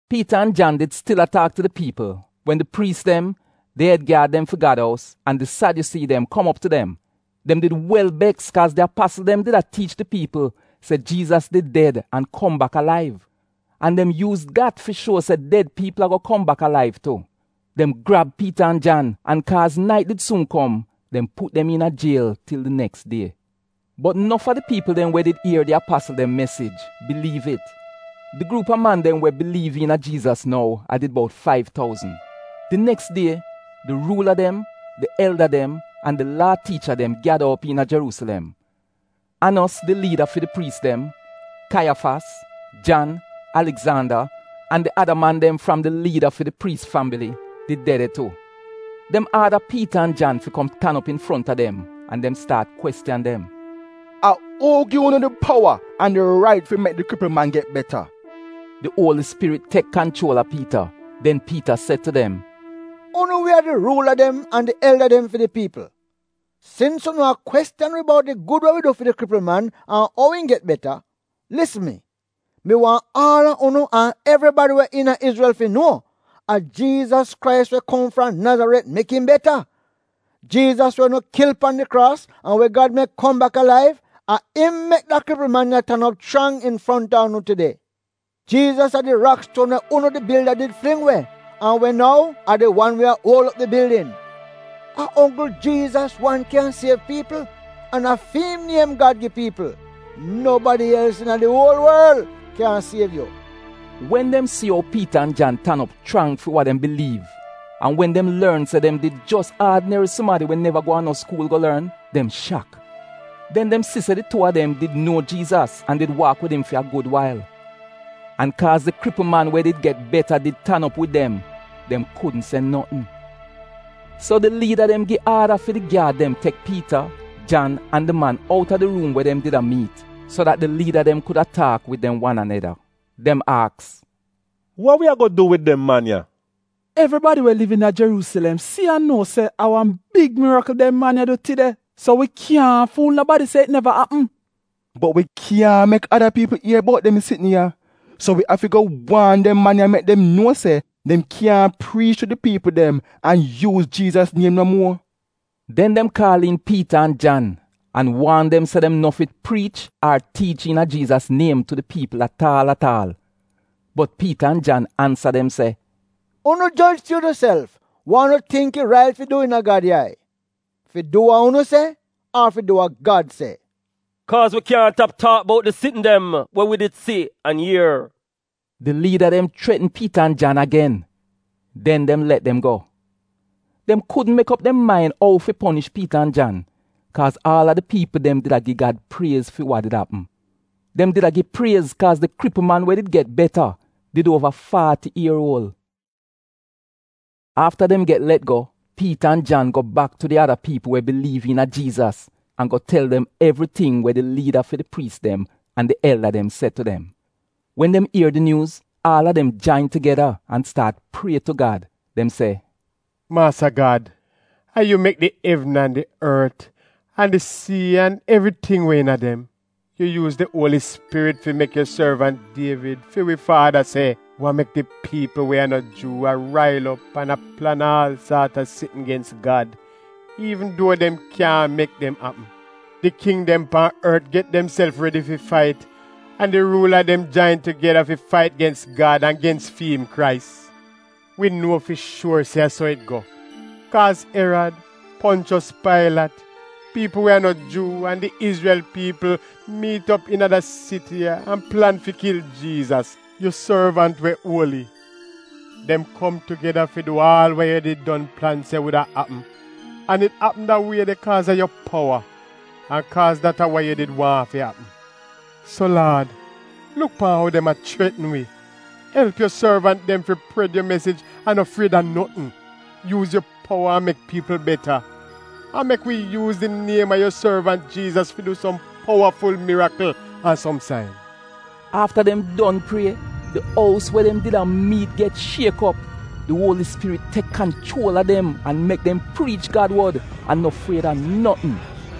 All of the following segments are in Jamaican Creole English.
Piita an Jan did stil a taak tu di piipl wen di priis dem, di ed gyaad dem fi Gad ous, an di Sadyusii dem kom op tu dem. Dem did wel beks kaaz di apasl dem did a tiich di piipl se Jiizas did ded an kom bak alaiv. An dem yuuz dat fi shuo se ded piipl ago kom bak alaiv tu. Dem grab Piita an Jan, an kaaz nait did suun kom, dem put dem iina jiel til di neks die. Bot nof a di piipl dem we did ier di apasl dem mesij biliiv it. Di gruup a man dem we biliiv iina Jiizas nou a did bout faiv touzn. Di neks die di ruula dem, di elda dem, an di Laa tiicha dem gyada op iina Jeruusilem. Anos di liida fi di priis dem, Kaiyafas, Jan, Aligzanda, an di ada man dem fram di liida fi di priis fambili did de de tu. Dem aada Piita an Jan fi kom tan op infronta dem an dem staat kwestiyan dem: “A uu gi unu di powa an di rait fi mek di kripl man get beta? Di Uoli Spirit tek kanchuol a Piita, den Piita se tu dem: “Unu we a di ruula dem an di elda dem fi di piipl, sins unu a kwestiyan wi bout di gud we wi du fi di kripl man an ou im get beta, lisn mi, mi waahn aal a unu an evribadi we iina Izrel fi nuo, a Jiizas Krais we kom fram Nazaret mek im beta. Jiizas we unu kil pan di kraas, an we Gad mek kom bak alaiv, a im mek da kripl man ya tan op chrang infronta unu tide. Jiizas a “‘di rakstuon we unu di bilda did fling we an we nou a di wan we a uol op di bildin.’ A onggl Jiizas wan kyan siev piipl, an a fi'im niem Gad gi piipl. Nobadi els iina di uol worl kyaahn siev yu.” Wen dem si ou Piita an Jan tan op chrang fi wa dem biliiv an wen dem lorn se dem a did jos aadineri sumadi we neva go a no skuul go lorn, dem shak. Den dem si se di tuu a dem did nuo Jiizas an did waak wid im fi a gud wail. An kaaz di kripl man we did get beta did tan op wid dem, dem kudn se notn. So di liida dem gi aada fi di gyaad dem tek Piita, Jan, an di man outa di ruum we dem did a miit so dat di liida dem kuda taak wid dem wan aneda. Dem aks “Wa wi ago du wid dem man ya? Evribadi we liv iina Jeruusilem si an nuo se a wan big mirikl dem man ya du tide, so wi kyaahn ful nobadi se it neva apm. Bot wi kyaahn mek ada piipl ier bout dem sitn ya. So wi afi go waan dem man ya mek dem nuo se dem kyaahn priich tu di piipl dem an yuuz Jiizas niem no muor.” Den dem kaal iin Piita an Jan an waan dem se dem no fi priich ar tiich iina Jiizas niem tu di piipl at aal at aal. Bot Piita an Jan ansa dem se, “Unu Joj fi unuself wa unu tingk it rait fi du iina Gad yai, fi du we unu se, ar fi du we Gad se? Kaaz wi kyaahn tap taak bout di sitn dem we wi did si an ier.” Di liida dem chretn Piita an Jan agen, den dem let dem go. Dem kudn mek op dem main ou fi ponish Piita an Jan, kaaz aal a di piipl dem did a gi Gad priez fi wa did apm. Dem did a gi priez kaaz di kripl man we did get beta did uova faati ier uol. Afta dem get let go Piita an Jan go bak tu di ada piipl we biliiv iina Jiizas an go tel dem evriting we di liida fi di priis dem an di elda dem se tu dem. Wen dem ier di nyuuz, aal a dem jain tugeda an staat prie tu Gad. Dem se “Maasa Gad, a yu mek di evn an di ort an di sii an evriting we iina dem. Yu yuuz di Uoli Spirit fi mek yu sorvant Dievid, fi wi faada se: ‘Wa mek di piipl we a no Juu a rail op an a plan aal saat a sitn gens Gad iivn duo dem kyaahn mek dem apm? Di king dem pan ort get demself redi fi fait, an di ruula dem jain tugeda fi fait gens Gad an gens fi'im Krais.’ Wi nuo fi shuor se a so it go, kaaz Erad, Ponchos Pailat, piipl we a no Juu, an di Izrel piipl miit op iina da siti ya an plan fi kil Jiizas, di wan we yu anaint. Dem kom tugeda fi du aal wa yu did don plan se wuda apm an it apm da wie de kaaz a yu powa an kaaz dat a wa yu did waahn fi apm. So Laad, luk pan ou dem a chretn wi! Elp yu sorvant dem fi pred yu mesij an no fried a notn. Yuuz yu powa an mek piipl beta. An mek wi yuuz di niem a yu sorvant Jiizas fi du som powaful mirikl an som sain.” Afta dem don prie, di ous we dem did a miitn get shiek op. Di Uoli Spirit tek kanchuol a dem an mek dem priich Gad wod an no fried a notn.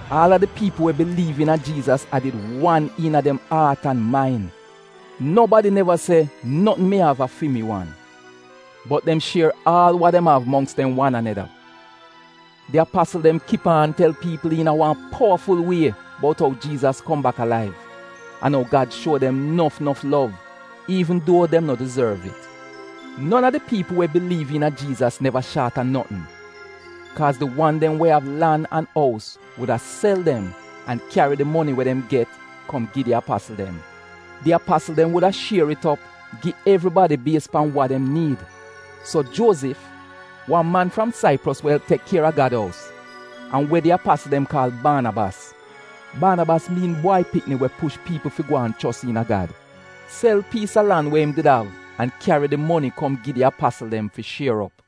Aal a di piipl we biliiv iina Jiizas a did wan iina dem aat an main. Nobadi neva se, ‘Notn mi av a fi mi wan.’ Bot dem shier aal wa dem av mongks dem wan aneda. Di apasl dem kip aan tel piipl iina wan powaful wie bout ou Jiizas kom bak alaiv, an ou Gad shuo dem nof nof lov, iivn duo dem no dizorv it. Non a di piipl we biliiv iina Jiizas neva shaat a notn, kaaz di wan dem we av lan an ous wuda sel dem an kyari di moni we dem get kom gi di apasl dem. Di apasl dem wuda shier it op gi evribadi bies pan wa dem niid. So Juozif, wan man we elp tek kier a Gad ous fram Saipros, an we di apasl dem kaal Baanabas (Baanabas miin Bwai pikni we inkorij piipl), sel piis a lan we im did av an kyari di moni kom gi di apasl dem fi shier op.